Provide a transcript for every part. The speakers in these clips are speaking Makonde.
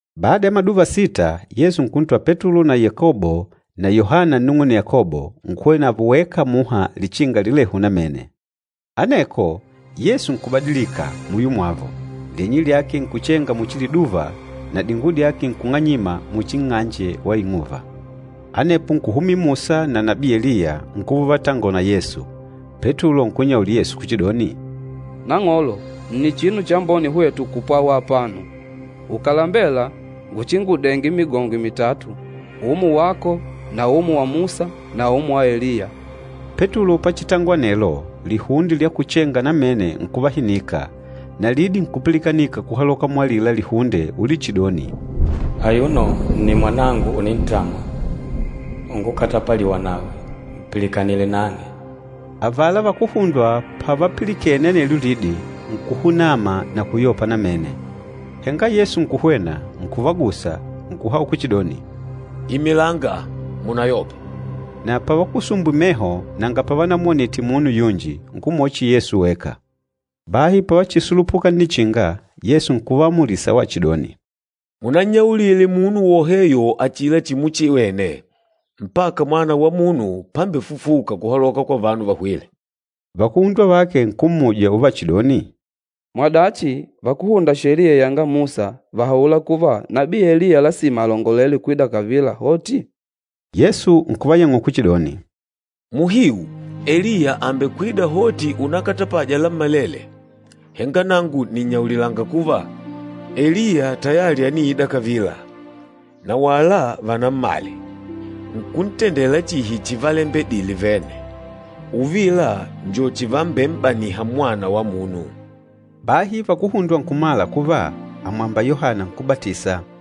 Bada ya maduva sita, Yesu nkuntwala Petulo na Yakobo na Yohana nnung'une Yakobo, nkuhwena navo weka muha lichinga lilehu namene. Aneko Yesu nkubadilika muyo mwavo, lyenye lyake nkuchenga muchi liduva na dinguwo dyake nkung'anyima muchi nng'anje wa ing'uva. Anepo nkuhumila Musa na nabii Eliya nkuva uvatangola na Yesu. Petulo nkunnyaulila Yesu kuchidoni, “Nang'olo, nni chinu chambone hwetu kupwawa apano! Ukàlembela, nguchingudenge migongwe mitatu, umo wako na umo wa Musa na umo wa Eliya.” Petulo pachitangola anelo, lihunde lyakuchenga namene nkuvahinika, na lidi nkupilikanika kuhaloka mualila lihunde ulichidoni, “Ayuno nni Mwanangu unintamwa, ungukatapaliwa nawe, mpilikanile nang'e.” Avala vakuhundwa pavalipilikene anelyo lidi, nkuhunama na kuyopa namene. Henga Yesu nkuhwena, nkuvagusa, nkuhaula kuchidoni, “Imilanga, munayope!” Na pavakusumbwile meho nanga pavanamwonite munu yunji, nkumwona chihi Yesu weka. Bahi pavachisulupuka nnichinga, Yesu nkuvaamulisa wachidoni, “Munannyaulile munu woheyo achila chimuchiwene, mpaka Mwana wa Munu pámbefufùkà kuhaloka kwa vanu vahwîle.” Vakuhundwa vake nkummuja uvachidoni, “Mwadachi, vakúhunda Sheliya yanga Musa vàhaula kuva nabii Eliya lasima alongolele kwida kavila hoti?” Yesu nkuvayang'ula kuchidoni, “Muhiu, Eliya àmbekwida hoti unakatapaja lammalele, henga nangu nìnnyaulilanga kuva, Eliya tayali àniida kavila, na wala vanammale, nkuntendela chihi chivalembedile vene. Uvila njo chivambem'baniha Mwana wa Munu.” Bahi vakuhundwa nkumala kuva àmwamba Yohana Nkúbatisa.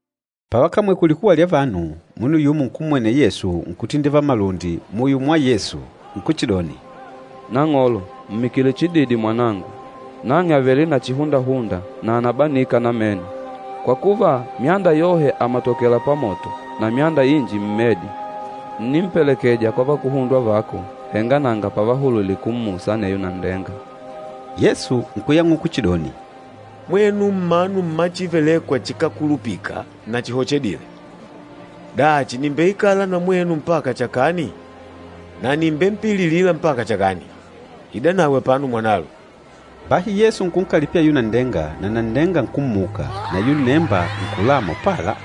Pavakamwele kulikuwa lya vanu, munu yumo nkummwenela Yesu nkutindivala malundi muyo mwa Yesu, nkuchidoni, “Nang'olo, mmikile chididi mwanangu. Nang'e àvele na chihundahunda, na ànabanika namene, kwa kuva, myanda yohe àmatokela pamoto na myanda inji mmedi. Ǹnimpelekeja kwa vakuhundwa vako, henga nanga pavahulwile kummusa aneyo nanndenga.” Yesu nkuyang'ula kuchidoni, “Mwenu mmanu mma chívelèkwà chikákulupila na chihochedîle! Dachi, nìmbeikala na mwenu mpaka chakani na nìmbempililila mpaka chakani? Idanawe apano mwanalo.” Bahi Yesu nkunkalipila ayula nanndenga, na nanndenga nkummuka, na ayula nnemba nkulama upala.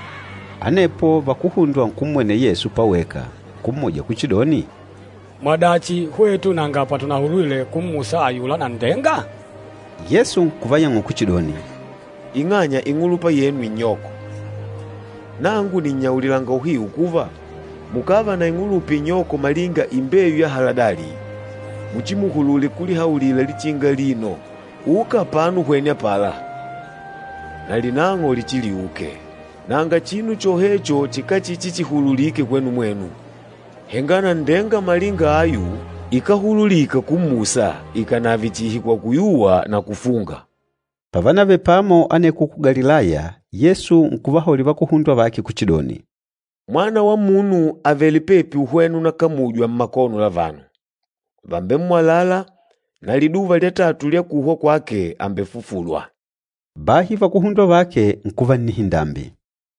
Anepo vakuhundwa nkummwenela Yesu paweka, nkummuja kuchidoni, “Mwadachi, hwetu nanga patunahulwile kummusa ayula nanndenga?” Yesu nkuvayang'ula kuchidoni, “Ing'anya ing'ulupa yenu inyoko. Nangu nìnnyaulilanga uhiu kuva, mukàva na ing'ulupa inyoko malinga imbeyu ya haladali, muchimuhulule kulihaulila lichinga alino, ‘Uka apano uhwene apala,’ na linang'o lichiliuke. Nanga chinu chohecho chikachichichihululike kwenu mwenu. [ Henga nanndenga malinga ayu ikáhululika kummusa ikànave chihi kwa kuyuwa na kufunga.”] Pavanavele pamo aneko ku Galilaya, Yesu nkuvahaulila vakuhundwa vake kuchidoni, “Mwana wa Munu àvele pepi uhwena unakamujwa mmakono la vanu. Vàmbemmwalala na liduva lya tatu lya kuhwa kwake àmbefufulwa.” Bahi vakuhundwa vake nkuva nnihindambi.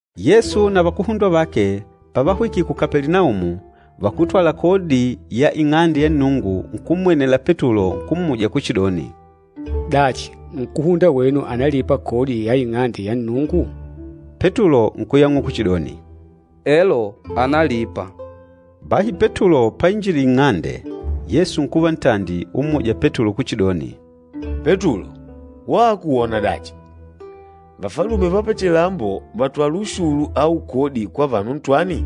Yesu na vakuhundwa vake pavahwikile ku Kapelinaumu, vakútwala kodi ya Ing'ande ya Nnungu nkummwenela Petulo, nkummuja kuchidoni, “Dachi, nkúhunda wenu ànalipa kodi ya Ing'ande ya Nnungu?” Petulo nkuyang'ula kuchidoni, “Elo, ànalipa.” Bahi Petulo painjidile nng'ande, Yesu nkuva ntandi ummuja Petulo kuchidoni, “Petulo, wako wona dachi? Vafalume va pachilambo vàtwala ushulu au kodi kwa vanu ntwani?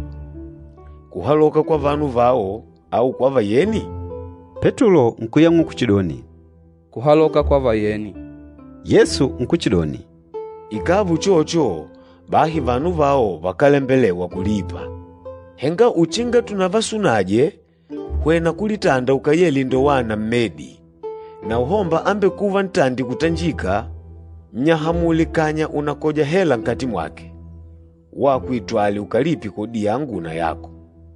Kuhaloka kwa vanu vao au kwa vayeni?” Petulo nkuyang'ula kuchidoni, “Kuhaloka kwa vayeni.” Yesu nkuchidoni, “Ikàva uchocho, bahi vanu vao vakálembelewa kulipa. Henga uchinga tunavasunaje, hwena kulitanda ukayele indowana mmedi, na uhomba ambekûva ntandi kutanjika, nnyahamule kanya unakoja hela nkati mwake. Wako itwale ukalipe kodi yangu na yako.”